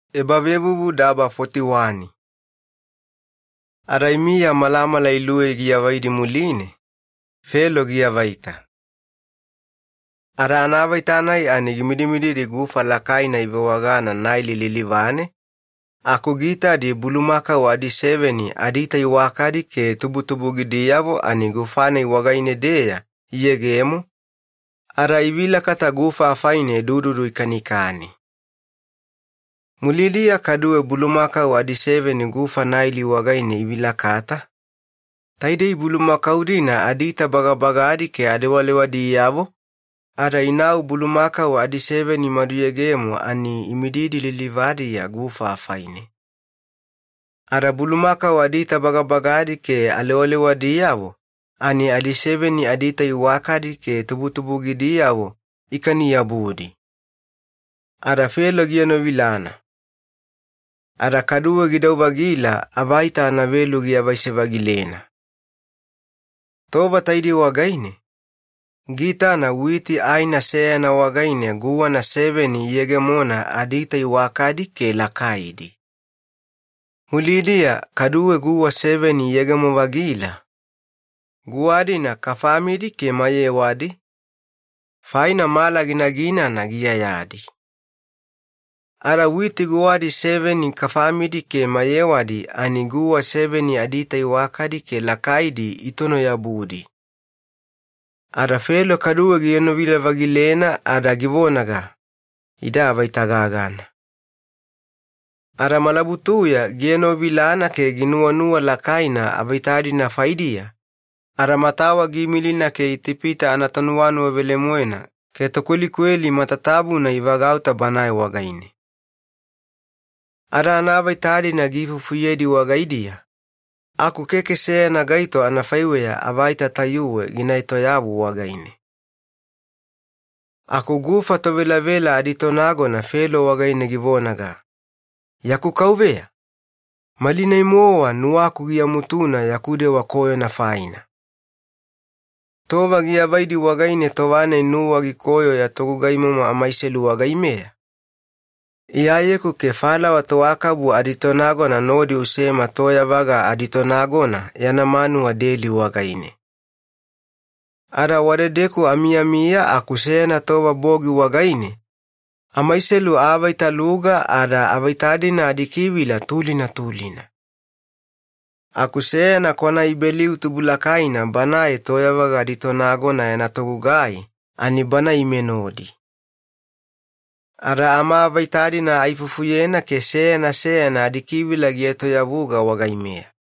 Felo anaavaita. Ada imiya malamala luwei giavaidi muline, Felo giavaita. Ada anaavaita-nai ani gimidimididi gufa lakaina ivewagana Naili lilivane aku giitadi bulumakau adiseveni adiita iwakadi ke tubutubugidiyavo ani gufa-nai wagaine-deya iyegemo, ada ivilakata gufa afaine dududu ikanikani. Mulidiya kaduwe bulumakau adiseveni gufa Naili wagaine ivilakata, taidei bulumakau-dina adiita bagabagana ke alewalewadiyavo ada inau bulumakau adiseveni imaduyegemo ani imididi lilivadiya gufa afaine. Ada bulumakau adiita bagabagana ke alewalewadiyavo ani adiseveni adiita iwakana ke tubutubugidiyavo ikaniyabudi. Ada Felo gienovilana. Ada kaduwe gidau-vagila avaita anavelu giavaise-vagilena. Tova taidei wagaine, giitana witi aina seyana wagaine guwana seveni iyegemona adiita iwakana ke lakaidi. Mulidiya kaduwe guwa seveni iyegemo-vagila, guwa-dina kafamidi ke mayewadi, faina mala ginaginana giiyayadi. Ada witi guwadi seveni kafamidi ke mayewadi ani guwa seveni adiita iwakana ke lakaidi itonoyabudi. Ada Felo kaduwe gienovila-vagilena ada givonaga, “Ida avaita gagana.” Ada malabutuya gienovilana ke ginuwanuwa lakaina avaita-dina faidiya, ada matawa giimilina ke Itipita anatonuwauyayavo ke tokwelikweli matatabuna ivagauta banae wagaine. Ada anaavaita-dina giifufuyedi wagaidiya, aku keke seyana gaito anafaiweya avaita tayuwe gina etoyavu wagaine. Aku gufa tovelavela aditonagona Felo wagaine givonaga, “Yaku kauveya, malinai-mowa nuwaku giamutuna yaku dewa koyona faina. Tova giavaidi wagaine tova-nai nuwa gikoyo ya togugaimomo amaiselu wagaimeya, iyayeku ke falawa toakabu aditonagona nodi usema toyavaga aditonagona yana manuwa deli wagaine. Ada wadedeku amiyamiya aku seyana tova bogi wagaine amaiselu aavaitaluga ada avaita-dina adikivila tulina tulina. Aku seyana kwanaIbeliu tubulakaina banae toyavaga aditonagona yana togugai ani bana ime nodi. Ada amaavaita-dina aifufuyena ke seyana seyana adikivila gietoyavuga wagaimeya.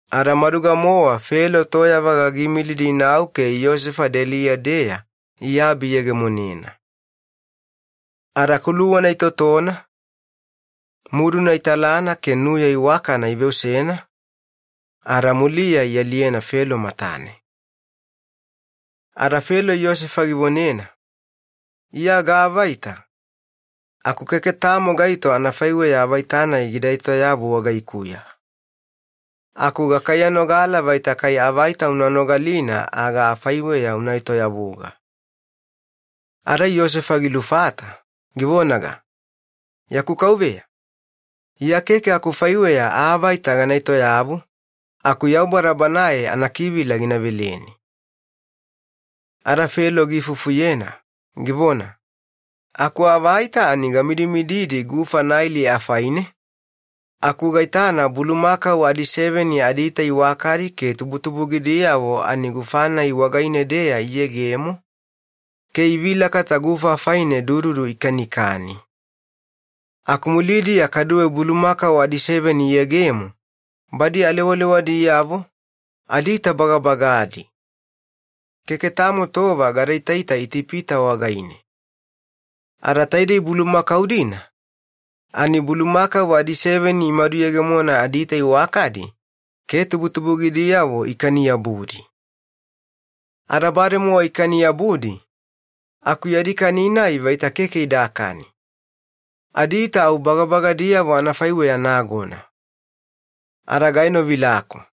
Ada maduga-mowa Felo toyavaga giimilidi inau ke Yosefa deliya-deya iabi iyegemonena. Ada kuluwana itotona, muduna italana ke nuya iwakana iveosena, ada muliya ialiyena Felo matane. Ada Felo Yosefa givonena, “Iya gaavaita, aku keke tamo gaito anafaiweya avaita-nai gida etoyavu wagaikuya. Aku gakaiyanogala vaita kai avaita una nogalina aga afaiweya una etoyavuga.” Ada Yosefa gilufata, givonaga, “Yaku kauveya, iya keke akufaiweya aavaita gana etoyavu, aku Yaubada Banae meyameyaganina anakivila gina veleni.” Ada Felo giifufuyena, givona, “Akuavaita ani gamidimididi gufa Naili afaine aku gaitana bulumakau adiseveni adiita iwakadi ke tubutubugidiyavo ani gufa-nai wagaine-deya iyegemo, ke ivilakata gufa afaine dududu ikanikani. Aku mulidiya kaduwe bulumakau adiseveni iyegemo badi alewalewadiyavo, adiita bagabagadi. Keke tamo tova gadaitaita Itipita wagaine. Ada taidei bulumakau-dina ani bulumakau adiseveni imaduyegemona adiita iwakana ke tubutubugidiyavo ikaniyabudi. Ada bademowa ikaniyabudi aku yadi kani-nai vaita keke idakani, adiita au bagabagadiyavo anafaiweya nagona. Ada gaenovilaku.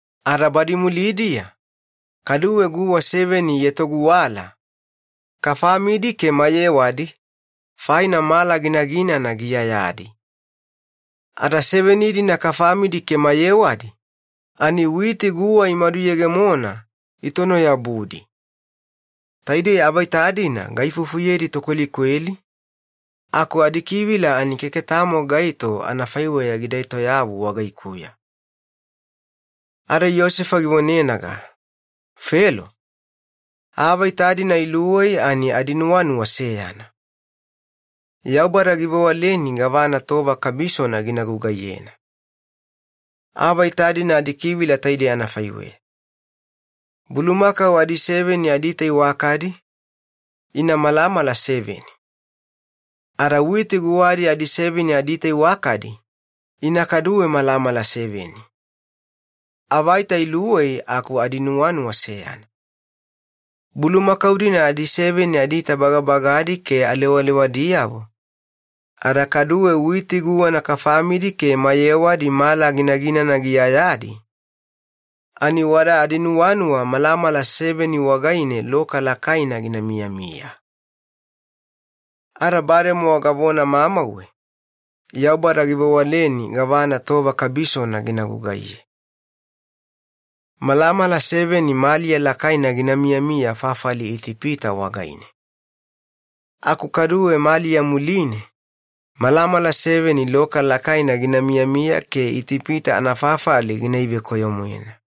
Badi mulidiya kaduwe guwa seveni ietoguwala kafamidi ke mayewadi, faina mala ginaginana giiyayadi. Ada seveni-dina kafamidi ke mayewadi ani witi guwa imaduyegemona itonoyabudi. Taidei avaita-dina gaifufuyedi tokwelikweli aku keke tamo gaito anafaiweya gida etoyavu adikivila wagaikuya.” Ada Yosefa givonenaga, “Felo, aavaita-dina luwei ani adinuwanuwa seyana. Yaubada givewaleni gavana tova kabisona gina gugaiyena. Aavaita-dina adikivila taidei anafaiweya: Bulumakau adiseveni tainei malamala seveni, ada witi guwadi adiseveni ina kaduwe malamala seveni. Avaita luwei aku adinuwanuwa gaitoma seyana faine. Bulumakau-dina adiseveni adiita bagabagana ke alewalewadiyavo, ada kaduwe witi guwana kafamidi ke mayewadi mala ginaginana giiyayadi ani wada adinuwanuwa malamala seveni wagaine loka lakaina gina miyamiya. “Ada bademowa gavona mamauwe: Yaubada givewaleni gavana tova kabisona gina gugaiye. Malamala seveni maliya lakaina gina miyamiya fafali Itipita wagaine, aku kaduwe maliya muline malamala seveni loka lakaina gina yegemo, ada maliya ina venuwavuluyena ke Itipita yana fafali gina ivekoyo-moena.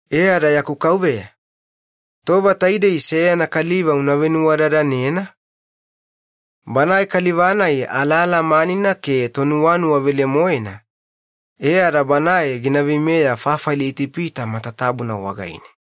“E ada yaku kauveya, tova taidei seyana kaliva una venuwadadanena, banae kaliva-nai alalamanina ke nuwanuwauyana, e ada banae gina veimeya fafali Itipita matatabuna wagaine.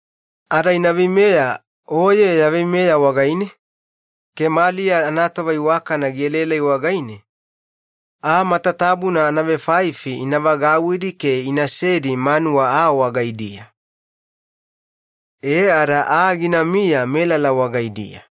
Ada ina veimeya oye ya veimeya wagaine ke maliya anatova iwakana gielaelai wagaine aa matatabuna anavenimafafalina ina vagauwidi ke inasedi manuwa aa wagaidiya. Ada aa ginamiya melala wagaidiya.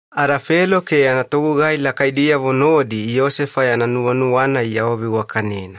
Ada Felo ke yana togugai lakaidiyavo nodi Yosefa yana nuwanuwa-nai iawaveiwakanena.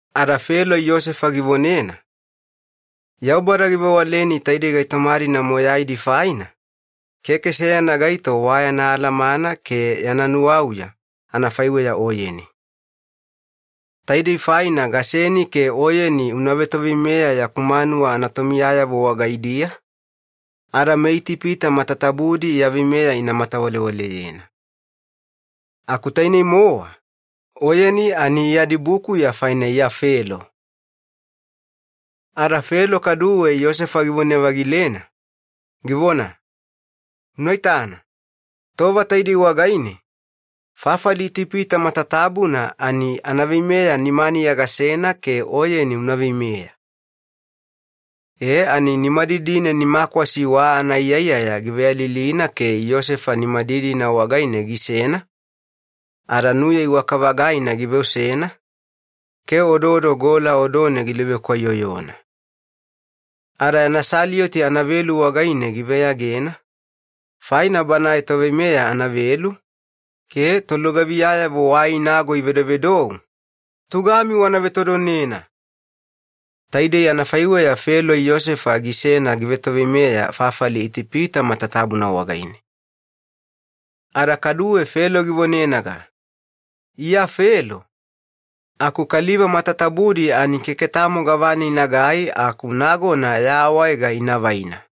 Ada Felo Yosefa givonena, “Yaubada givewaleni taidei gaitoma-dina matatabuna faina, keke seyana gaito wayana alamana ke yana nuwauya anafaiweya oyeni. Taidei faina gaseni ke oyeni una vetoveimeya yaku manuwa anatomiyayavo wagaidiya, ada meItipita matatabudi ya veimeya ina matawalewaleyena. Aku tainei-mowa oyeni ani iya dibukuya faina iya Felo.” Ada Felo kaduwe Yosefa givone-vagilena, givona, “Unaitana, tova taidei wagaine fafali Itipita matatabuna anaveimeya nimaniya gasena ke oyeni una veimeya.” E ada nimadidine nimakwasi wa anaiyaiyaya giveyalilina ada Yosefa nimadidina wagaine gisena, ke nuya iwaka-vagaina giveosena ke odoodo gola odone giluvekwaiyoyona. Ada yana salioti anavelu wagaine giveyagena, faina banae toveimeya anavelu, ke tolugaviyayavo wai inago ivedovedou, “Tugami wana vetodonedi!” Taidei anafaiweya Felo Yosefa gisena givetoveimeya fafali Itipita matatabuna wagaine. Ada kaduwe Felo givonenaga, “Iya Felo, aku kaliva matatabudi keke tamo gavana inagai aku nagona ya awaega ina vaina.”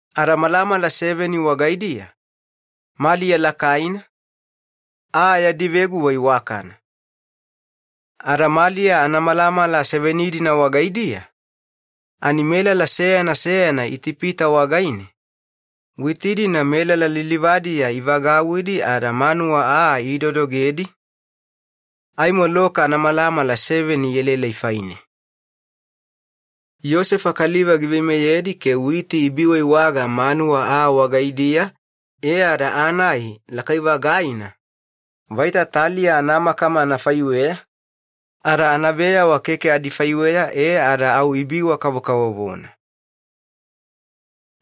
Ada malamala seveni wagaidiya maliya lakaina, aa yadi veguwa iwakana. Ada maliya anamalamala seveni wagaidiya ani melala seyana seyana Itipita wagaine, witi-dina ivagauwidi melala lilivadiya ada manuwa aa idodogedi aimo loka anamalamala seveni ielaelai faine. Yosefa kaliva giveimeyedi ke witi ibiiwaiwaga manuwa aa wagaidiya e ada aa-nai lakai-vagaina anafaiweya taliya anamakama, ada anaveyawa keke adifaiweya ada au ibiwa-kavokavovona.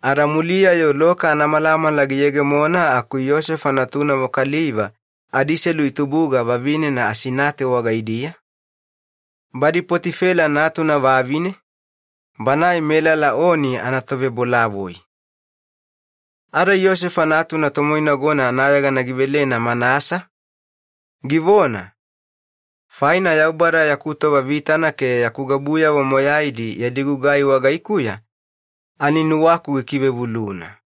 Ada muliya-yo loka anamalamala giyegemona aku Yosefa natunavo kaliva adiselu itubuga vavinena Asinate wagaidiya, badi Poti-Fela natuna vavine, banae Oni anatovebolavoi. Ada natuna tomoinagona anayegana givelena Manasa, givona, “Faina Yaubada yaku tova vitana ke yaku gabuyavo matatabuna yadi gugai wagaikuya ani nuwaku gikivevuluna.”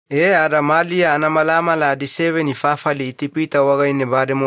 E ada maliya anamalamala bademowa giavaina fafali Itipita wagaine,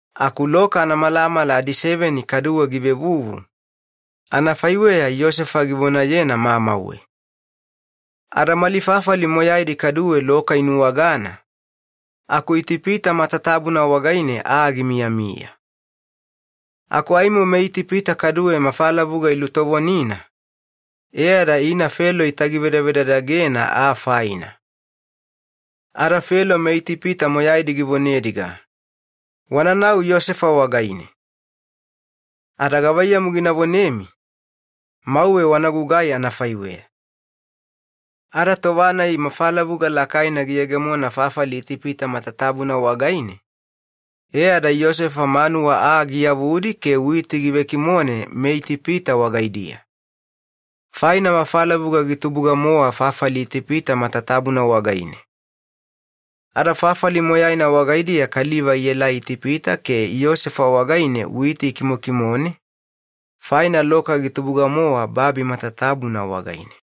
aku loka anamalamala seveni kaduwe givevuvu, anafaiweya Yosefa givonayena mamauwe. Ada mali fafali moyaidi kaduwe loka inuwagana, aku Itipita matatabuna wagaine aa gimiyamiya manuwa aa wagaidiya. Aku aimo meItipita kaduwe mafalavuga ilutovonina e ada ina Felo itagivedavedadagena aa faina, ada givonediga, “Wananau Yosefa wagaine, ada gavaiyamu gina vonemi, mauwe wanagugai anafaiweya.” Ada tova-nai mafalavuga lakaina giyegemona fafali Itipita matatabuna wagaine, e ada Yosefa manuwa aa giyavudi ke witi givekimone meItipita wagaidiya, faina mafalavuga gitubuga-mowa fafali Itipita matatabuna wagaine. Ada fafali moyaina wagaidiya kaliva ielai Itipita ke Yosefa wagaine witi ikimokimone, faina loka gitubuga-mowa babi matatabuna wagaine.